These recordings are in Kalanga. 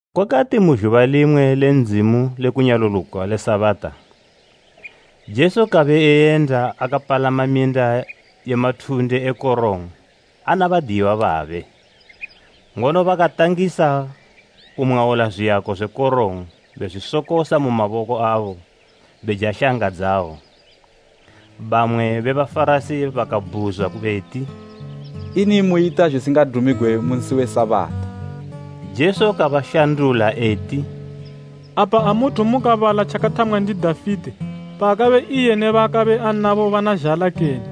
Kwakati mu zhuba limwe le Ndzimu le kunyaluluka le Sabata, Jesu kabe eyenda akapalama minda ye mathunde e korong ana badiyiwa babe, ngono bakatangisa kumwaula zwiyako zwe korong bezwisokosa mu maboko abo beja shanga dzayo. Bamwe be Bafarasi bakabhuzwa beti, “Ini muyita tjisingadumigwe mu nsi we Sabata?” Jesu kabashandula eti, “Apa amuthu mukabala tjakathamwa ndi Dafite, paakabe iye ne baakabe anabo bana zhala kene?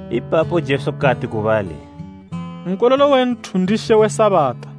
Ipapo Jesu kati ku bali, “Nkololo we Nthu ndi She we Sabata.”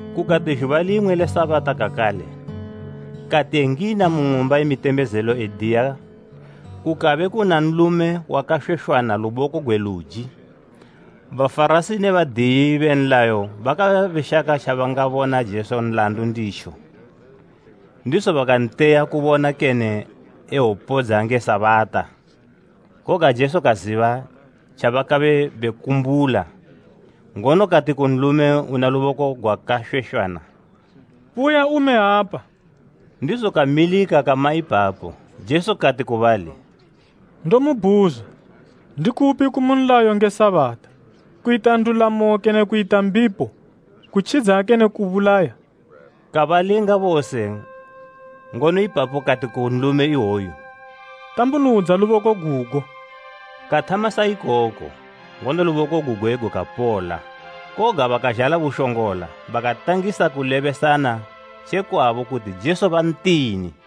Kukati zhuba limwe le Sabata kakale, kati engina mu ng'umba ye mitembezelo ediya, kukabe kuna nlume wakashweshwana luboko gwe luji. Bafarasi ne badiyi be nlayo bakabe beshaka tjabangabona Jesu nlandu nditjo, ndizo bakanteya kubona kene ewopodza nge Sabata. Koga Jesu kaziba tjabakabe bekumbula, ngono kati ku nlume una luboko gwakashweshwana, “Buya ume apa.” Ndizo kamilika kama ipapo. Jesu kati ku bali, “Ndomubhuzwa, ndikupi kumu nlayo nge Sabata, kuyita ndulamo kene kuyita mbipo, kutjidza kene kubulaya?” Kabalinga bose ngono ipapo kati ku nlume iwoyu “Tambunudza luboko gugo.” Kathama sa ikoko, ngono luboko gugwe gukapola. Koga bakazhala bushongola bakatangisa kulebesana tjekwabo kuti Jesu bantini.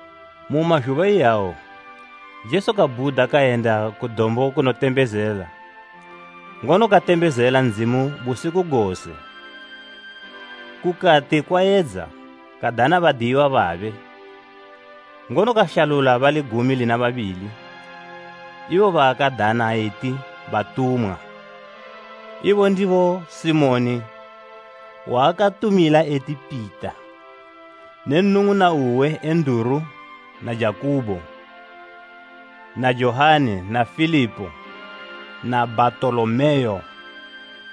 Mu mazhuba iyawo, Jesu kabhuda kayenda ku dombo kunotembezela, ngono katembezela Ndzimu busiku gose. Kukati kwayedza, kadana badiyiwa babe, ngono kashalula bali gumi lina babili, ibo baakadana eti batumwa. Ibo ndibo Simoni (waakatumila eti Pita) ne nnung'una uwe Enduru na Jakubo, na Johani na Filipo na Bhatolomeo,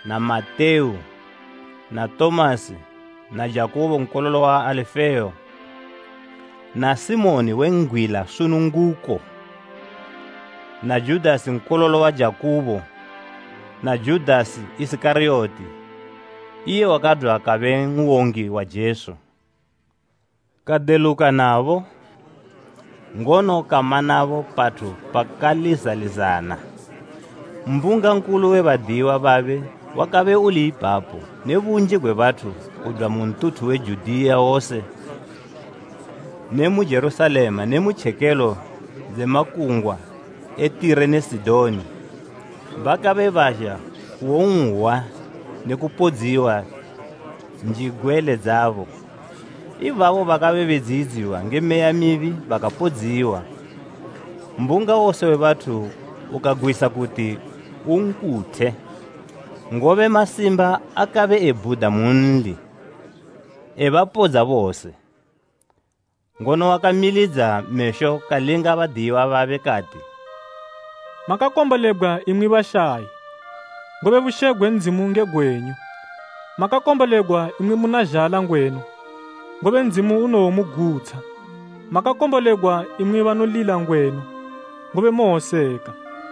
na Matewu, na Tomasi na Jakubo nkololo wa Alifeo na Simoni we ngwila sununguko, na Judasi nkololo wa Jakubo, na Judasi Isikariyoti, iye wakadwa kabe n'wongi wa Jesu. Kadeluka nabo, ngono kama nabo pathu pakalizalizana. Mbunga nkulu we badiyiwa babe wakabe uli ipapo ne bunji gwe bathu kudwa mu ntuthu we Judiya wose ne mu Jerusalema ne mu tjekelo dze makungwa e Tire ne Sidoni, bakabe bazha kuwon'hwa ne kupodziwa njigwele dzabo. Ibabo bakabe bedziyidziwa nge meya mibi bakapodziwa. Mbunga wose we bathu ukagwisa kuti unkuthe, ngobe masimba akabe ebhuda munli, ebapodza bose. Ngono wakamilidza mesho kalinga badiyiwa babe kati, “Makakombolegwa imwi bashayi, ngobe bushe gwe Ndzimu nge gwenyu. Makakombolegwa imwi muna zhala ngwenu, ngobe Ndzimu unowomugutsha. Makakombolegwa imwi banolila ngwenu, ngobe mowoseka.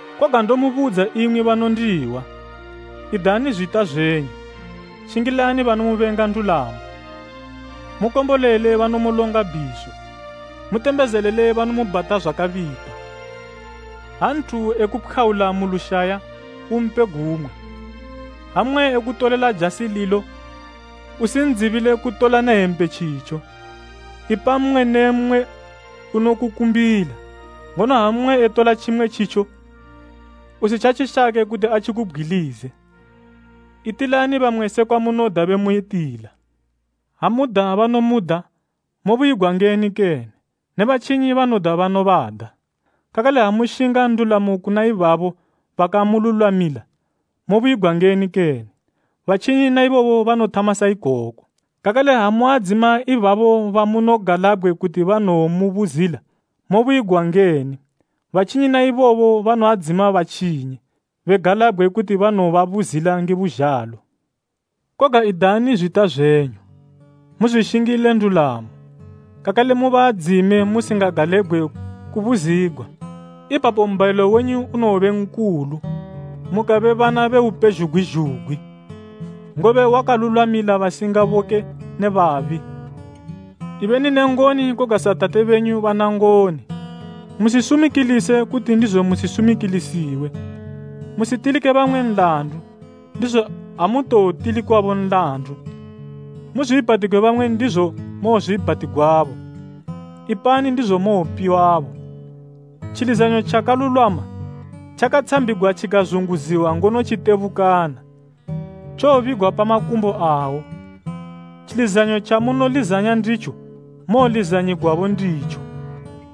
“Koga ndomubudza imwi banondihwa, idani zwita zwenyu, shingilani banomubenga ndulamo. Mukombolele banomulonga bhiso, mutembezelele banomubhata zwakabipa. Ha nthu ekupkhwaula mu lushaya, umpe gumwe. Ha mmwe ekutolela jasi lilo usindzibile kutola ne hempe tjitjo. Ipa mmwe ne mmwe unokukumbila, ngono ha mmwe etola tjimwe tjitjo, usitjatjishake kuti atjikubgwilize. Itilani bamwe sekwa munoda bemuyitila.” “Ha muda banomuda, mobuyigwa ngeni kene? Ne batjinyi banoda banobada. Kakale ha mushinga ndulamo kuna ibabo bakamululwamila, mobuyigwa ngeni kene? Batjinyi na ibobo banothama sa ikoko. Kakale ha muadzima ibabo bamunogalabgwe kuti banowomubuzila, mobuyigwa ngeni? Batjinyi na ibobo banoadzima batjinyi, begalabgwe kuti banowobabuzila nge buzhalo. Koga idani zwita zwenyu, muzwishingile ndulamo, kakale mubaadzime musakagalabgwe kubuzigwa. Ipapo mbhayilo wenyu unowobe nkulu, mukabe bana be Upezhugwi zhugwi, ngobe wakalulwamila basingaboke ne babi. Ibeni ne ngoni koga sa Tate benyu bana ngoni.” “Musisumikilise, kuti ndizo musisumikilisiwe. Musitilike bamwe nlandu, ndizo amutowotilikwabo nlandu. Muzwiibhatigwe bamwe ndizo mowozwiibhatigwabo. Ipani ndizo mowopiwabo. Tjilizanyo tjakalulwama, tjakatshambigwa tjikazunguziwa ngono tjitebukana, tjowobigwa pa makumbo awo.” Tjilizanyo tjamunolizanya nditjo mowolizanyigwabo nditjo.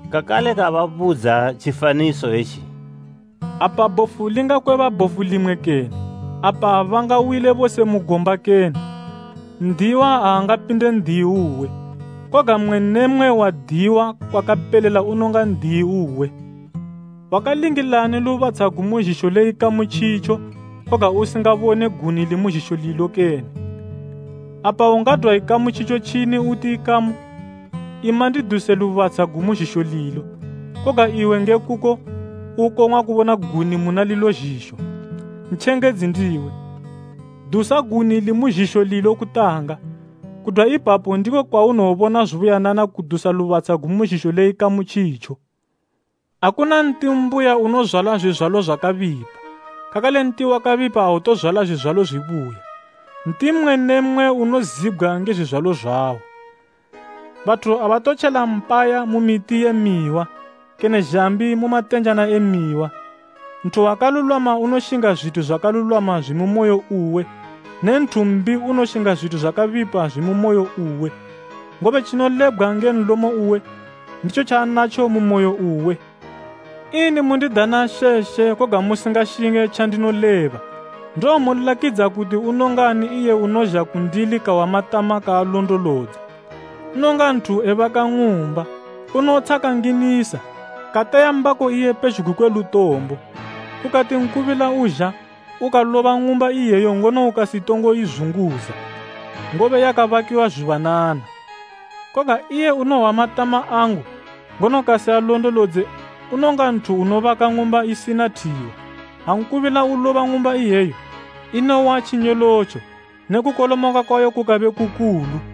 Kakale kababudza tjifaniso etji, “Apa bhofu lingakweba bhofu limwe kene? Apa abangawile bose mu gomba kene? N'diyiwa aangapinde n'diyi uwe, koga mmwe ne mmwe wadiyiwa kwakapelela unonga n'diyi uwe.” “Wakalingilani lubatsha gumu zhisho le ikamu tjitjo koga usingabone guni limu zhisho lilo kene? Apa ungadwa ikamu tjitjo tjini uti ‘ikamu, ima ndiduse lubatsha gumu zhisho lilo,’ koga iwe nge kuko ukong'wa kubona guni muna lilo zhisho? Ntjengedzi ndiwe! Dusa guni limu zhisho lilo kutanga, kudwa ipapo ndiko kwaunowobona zubuyanana kudusa lubatsha gumu zhisho le ikamu tjitjo. “Akuna nti mbuya unozwala zwizwalo zwakabipa, kakale nti wakabipa autozwala zwizwalo zwibuya. Nti mmwe ne mmwe unozibgwa nge zwizwalo zwawo. Bathu abatotjela phaya mu miti ye mihwa, kene zhambi mu matenjana e mihwa. Nthu wakalulwama unoshinga zwithu zwakalulwama zwimu moyo uwe ne nthu mbi unoshinga zwithu zwakabipa zwimu moyo uwe, ngobe tjinolebgwa nge nlomo uwe, nditjo tjaanatjo mu moyo uwe. “Ini mundidana ‘She, She,’ koga musingashinge tjandinoleba? Ndowomulakidza kuti unongani iye unozha kundili kahwa matama kaalondolodza. Unonga nthu ebaka ng'umba, unotsha kanginisa, kateya mbako iye pezhugwi kwe lutombo. Kukati nkubila uzha, ukaloba ng'umba iyeyo ngono ukasitongo izunguza, ngobe yakabakiwa zubuyanana. Koga iye unohwa matama angu, ngono kasialondolodze unonga nthu unobaka ng'umba isina thiwa. Ha nkubila uloba ng'umba iyeyo, inowa tjinyolotjo ne kukolomoka kwayo kukabe kukulu.”